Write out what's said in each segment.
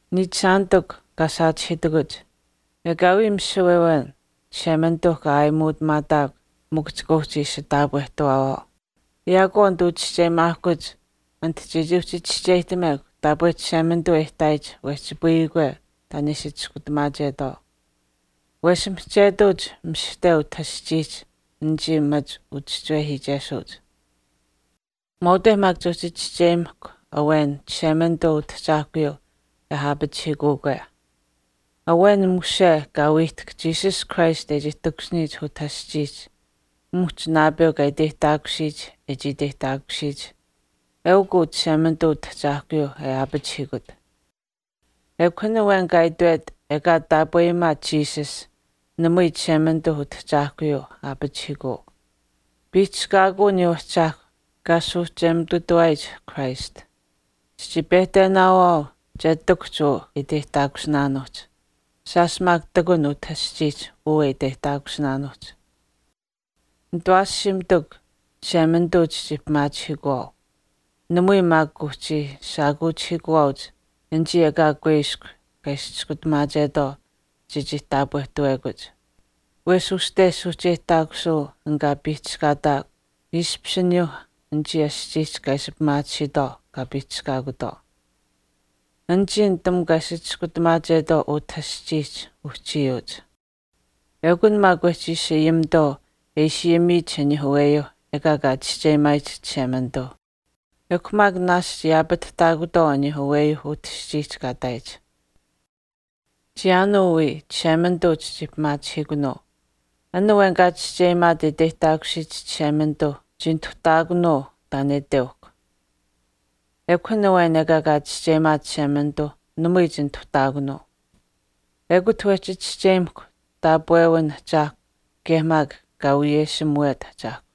Niichishaanitikw kaa saachihiitakuch ekaawii misiwe awen Chishemanituuh kaa aayimuutamaataakw mikw chika uhchi ishi taapwehtawaawaau. Yaakwaau nituu chischeyimaahkuch ati chechii uhchi chischeyihtamekw taapwe Chishemanituu e ihtaayich wehchipayikwe taan e ishi chiskutamaachetwaau. Wesh mihchetuuch mishihte utah aschiihch anichii machi uchischiwehiichesuuch. Mwaaute chechii uhchi chischeyimahkw awen Chishemanituuh Utahchaahkuyuu e aapachihiikuukwe. Awen mushe kaa wiihtahk Jesus Christ e chii takushiniyich utah aschiihch muhch naapeu kaa iteyihtaakusiyich e chii iteyihtaakusiyich, eukw uu Chishemanituu Utahchaahkuyuu e aapachihiikut. Ekw an awen kaa itwet ekaa taapweyimaat Jesus namui Chishemanituuh Utahchaahkuyuuh aapachihiikuu. Piihchishkaakuu aniyuu Ahchaahkwa kaa suuhcheyimututawaat Christ. Chichii pehtenaawaau che ihtakuhch uu e iteyihtaakusinaanuuhch. Shaash maak ihtakun utah aschiihch uu e iteyihtaakusinaanuuhch. Nitawaashiimitikw, Chishemanituu chichii pimaachihiikuwaau. Namui maak kuuhchii shaakuuchihiikuwaauch anichii ekaa kuiskw kaa ishi chiskutamaachetwaau chechii taapwehtawekuch. Wesh uste suuhcheyihtaakusuu an kaa piihchishkaataakw ishpishaat aniyuuh anichii aschiihch kaa ishi pimaatisiitwaau kaa piihchishkaakutwaau. Anichii nitamukw kaa ishi chiskutamaachetwaau utah aschiihch uhchiyuuch. Ekun maak wehchi ishi ayimitwaau e ishi ayimiyich aniyuuh aweyuuh ekaa kaa chischeyimaayich Chishemanituuh, ekw maak naashch yaapatihtaakutwaau aniyuuh aweyuuh utah aschiihch kaa ihtaayich. Chiyaanuu wii Chishemanituu chichii pimaachihiikunuu. An awen kaa chischeyimaat e iteyihtaakusiyich Chishemanituuh chinituhtaakunuu taan e iteuhkw. Ekw an awen ekaa kaa chischeyimaat Chishemanituu namui chinituhtaakunuu. Ekut wehchi chischeyimahkw taapwewin Ahchaahkw kaye maak kaa wiyeshimuwet ahchaahkw.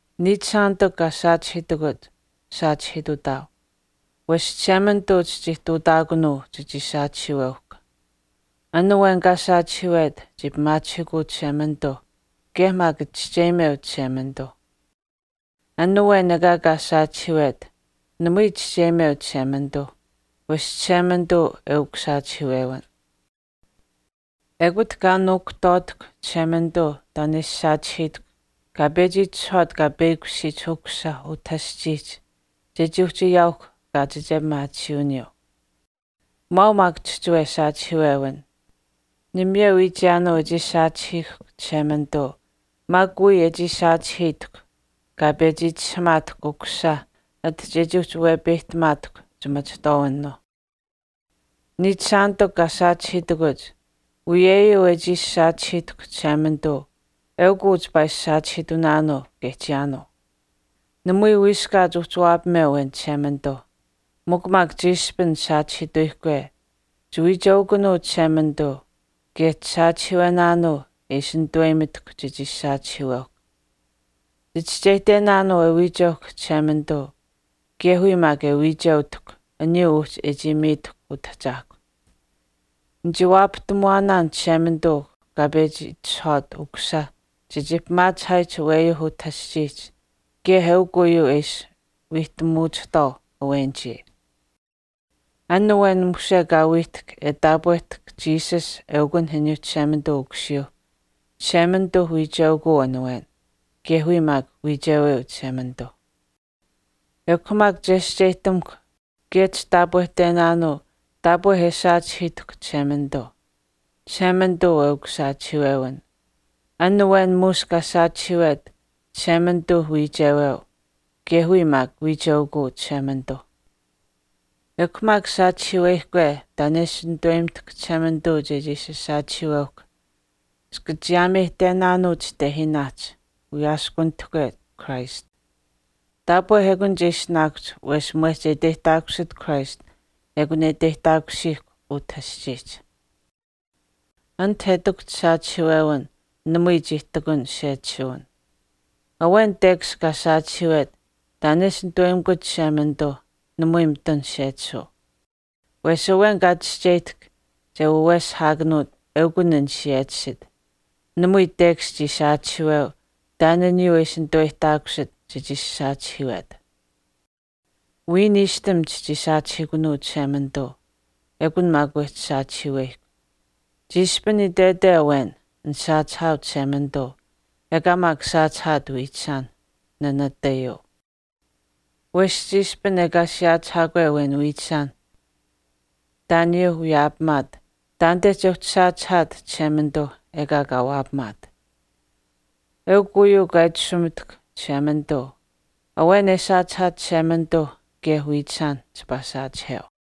Niichishaanitikw kaa saachihiitakuch saachihiitutaau. Wesh Chishemanituu chitihtuutaakunuu chechii saachihiiweuhkw. An awen kaa saachihiiwet chii pimaachihiikuu Chishemanituuh kaye maak chischeyimeu Chishemanituuh. An awen ekaa kaa saachihiiwet namui chischeyimeu Chishemanituu wesh Chishemanituu eukw saachihiiwewin. Ekut kaa nuukuhtwaatahkw Chishemanituu taan e ishi saachihiitahkw kaa pechi itishahwaat kaa peyakushiyich Ukusisa utah aschiihch chechii uhchi ayaauhkw kaachiche pimaatisiiwiniyuu. Mwaau maak chihchiwe saachihiiwewin. Namayeu wii chiyaanuu e chii saachihiihkw Chishemanituu maak wiya e chii saachihiitahkw kaa pechi itishahuumaatahkw Ukusisa ati chechii uhchi wepeyihtamaatahkw chimachihtwaawinuu. Niichishaanitikw kaa saachihiitakuch uyeyuu e chii ishi saachihiitahkw Chishemanituu eukw uu chipaa ishi saachihiitunaanuu kaye chiyaanuu. Namui wiiskaat uhchi waapameu awen Chishemanituu, mikw maak chiishpin saachihiituyihkwe chiwiicheukunuu Chishemanituu kaye chisaachihiiwenaanuu e ishi nituweyimitahkw chechii ishi saachihiiweuhkw. Chichischeyihtenaanuu e wiicheuhkw Chishemanituu kaye wiya maak e wiicheutahkw aniyuu uhchi e chii miitahkw Utahchaahkwa. Nichii waapahtamuwaanaan Chishemanituu kaa pechi itishahwaat Ukusisa chechii pimaachihaayich aweyuuh utah aschiihch kaye eukw uyuu e ishi wiihtamuchihtwaau awenichii. An awen mushe kaa wiihtahk e taapwehtahk Jesus eukun aniyuuh Chishemanituuh Ukusiyuuh, Chishemanituuh wiicheukuu an awen. Kaye wiya maak wiicheweu Chishemanituu. Ekw maak chescheyihtamuhkw kaye chitaapwehtenaanuu taapwe e saachihiitahkw Chishemanituu. Chishemanituu eukw saachihiiwewin. An awen muush kaa saachihiiwet Chishemanituuh wiicheweu kaye wiya maak wiicheukuu Chishemanituuh. Ekw maak saachihiiweyihkwe taan e ishi nituweyimitahkw Chishemanituu chechii ishi saachihiiweuhkw chika chiyaameyihtenaanuu chitehiinaahch wiyaaskunitahkwe Christ. Taapwe ekun che ishinaakuhch wesh mwehch e iteyihtaakusit Christ ekun e iteyihtaakusiihkw utah aschiihch. Ati e ihtakuhch saachihiiwewin namui chii ihtakun sechisuwin. Awen tekash kaa saachihiiwet taan e ishi nitaweyimikut Chishemanituu namui mitun sechisuu. Wesh awen kaa chischeyihtahk che waweshihaakanuut eukun an siyechisit. Namui tekash chii saachihiiweu taan aniyuuh e ishi nituweyihtaakusit chechii ishi saachihiiwet. Wiya niishtam chichii saachihiikunuu Chishemanituu. Ekun maak wehchi saachihiiweyihkw. Chiishpin itwete awen, nisaachihaau Chishemanituu, ekaa maak saachihaat wiichishaan, nanatayuu. Wesh chiishpin ekaa siyaachihaakwe awen wiichishaanh taan aniyuuh wiyaapamaat taanite chechii uhchi saachihaat Chishemanituuh ekaa kaa waapamaat. Eukw uyuu kaa itashumitahkw Chishemanituu, “Awen e saachihaat Chishemanituuh kaye wiichishaan chipaa saachiheu.”